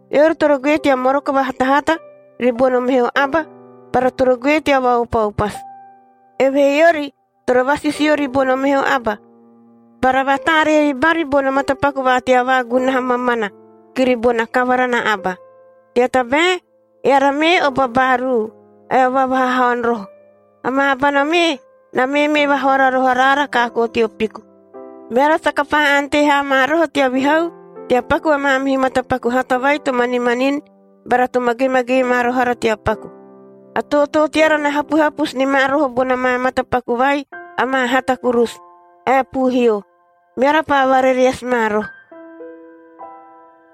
Eori toro goe tea moroko vahatahata ribono meho aba bara toro goe tea vaopaopasu. Evehee eori toro vasisio ribono meho aba bara vataaree ribari bono matapaku va tea vaagunaha mamana kiri bona kavara na aba. Tea tabae eara mee o babaaruu ae o vaavahahaon roho. Amaa abana mee na meemee vahoara roho araara kaakoo teo piku. Meara saka paa ante haa ma roho tea vihau tea paku a maamihu matapaku hata vai to manimanini bara to magemagee ma roho ara tea paku. A tootoo teara na hapuhapusu ni ma roho bona maa matapaku vai amaa hata kurusu ae puuhio. Meara paa varereasi ma roho.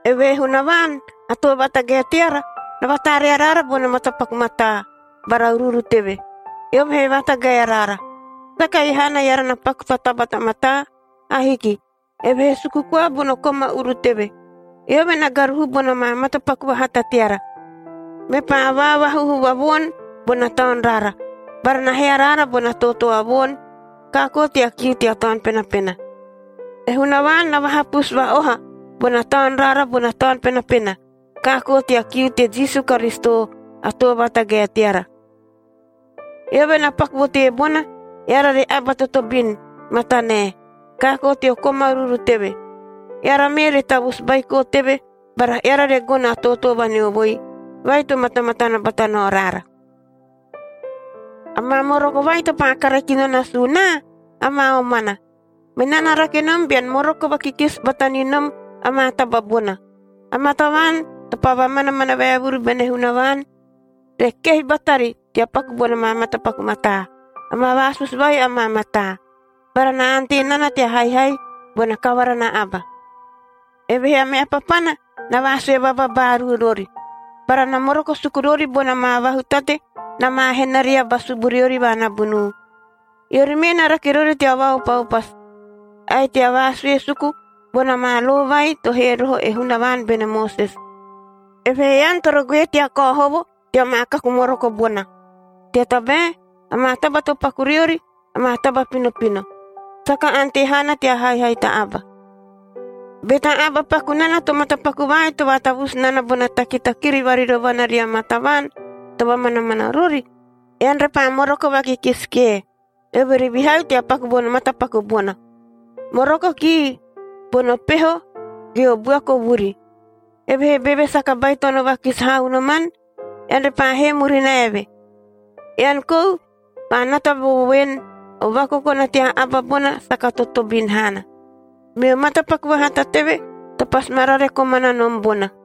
Evehee Hunavaan a Too Vatagae teara na vataaree araara bono matapaku mataa bara uruuru teve, eove he vatagae araara. Saka ei haana eara na paku ta taba ta mataa. Ahiki! Evehee suku koa bono koma uru teve. Eove na garuhu bona maa matapaku vahata teara, mepaa vaavahuhu va voon bona taun raara bara na hee araara bona tootoo a voon kaakoo tea kiu tea Taun Penapena. E Hunavaan na vaahapusu va-oha bona taun raara bona Taun Penapena kaakoo tea kiu te Jisu Karisito a Too Vatagae teara. Eove na paku vo teebona, eara re aba totobin matanae kaakoo teo koma uruuru teve. Eara mee re tavusu baiko teve bara eara re gono a tootoo vaneovoi vai to matamatana bata nao raara. Amaa moroko vai to paa kare kino nasuu naa, amaa omana. Menaa na rake nom bean moroko vakikisi bata ni nom amaa taba bona, amaa tavaan to paa vamanamana vaevuru bene Hunavaan re kehi batari tea paku bona maa matapaku mataa. Amaa vaasusu vai amaa mataa, bara na ante nana tea haihai bona kavara na aba. Evehee a meha papana na vaasue vababaaruu rori, bara na moroko suku rori bona maa vahutate na maa henaria ba suburiori va nabunuu. Eori mee na rake rori tea vaopaopasu, ae tea vaasue suku bona maa lo vai to hee roho e Hunavaan bene Moses. Evehee ean toro goe tea kao hovo tea maa kaku moroko bona, tea tabae amaa taba to paku riori amaa taba pinopino, saka ante haana tea haihai ta aba. Be ta aba paku nana to matapaku vai to vaatavusu nana bona takitakiri varirovana ria maa tavaan to vamanamana rori, ean repaa moroko vakikisi kie, eove re vihau tea paku bono matapaku bona. Moroko kii bono peho ge o buaku o vuri, evehee beve saka baitono vakisi haa unoman, ean repaa hee murina eve. Ean kou paa nata vo voen, o vakokona tea aba bona saka totobin haana. Meo matapaku vahata teve to pasi ma rare komana nom bona.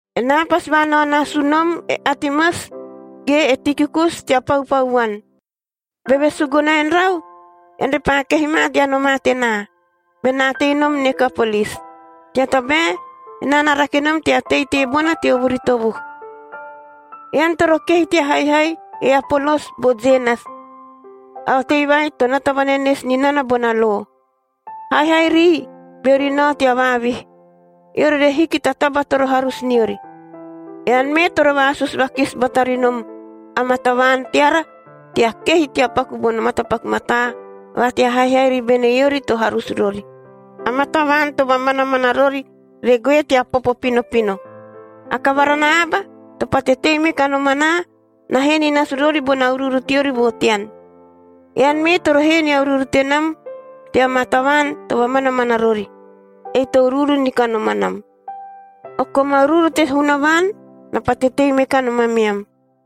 Enaa pasi vaanao nasu nom e Atemas ge e Tikikus tea paupau vuan. Beve suguna en rau, ean repaa kehi ma tea nomaa tenaa, benaa tei nom Nikopolis, tea tabae enaa na rake nom tea tei teebona teo vuri tovuhu. Ean toro kehi tea haihai e Apolos bo Zenas, a otei vai to nata vanenesi ni nana bona lo. Haihai rii beori nao tea vaavihi, eori re hiki ta taba toro harusu niori. Ean mee toro vaasusu vakisi bata ri nom amaa tavaan teara tea kehi tea paku bono matapaku mataa va tea haihai ribene eori to harusu rori; amaa tavaan to vamanamana rori re goe tea popo pinopino. A kavara na aba to pate tei me kanom anaa na hee ni nasu rori bona uruuru teori vo tean. Ean mee toro hee nia uruuru tenam tea maa tavaan to vamanamana rori – ei to uruuru ni kanom anam. O koma uruuru te Hunavaan na pate tei me kanom ameam.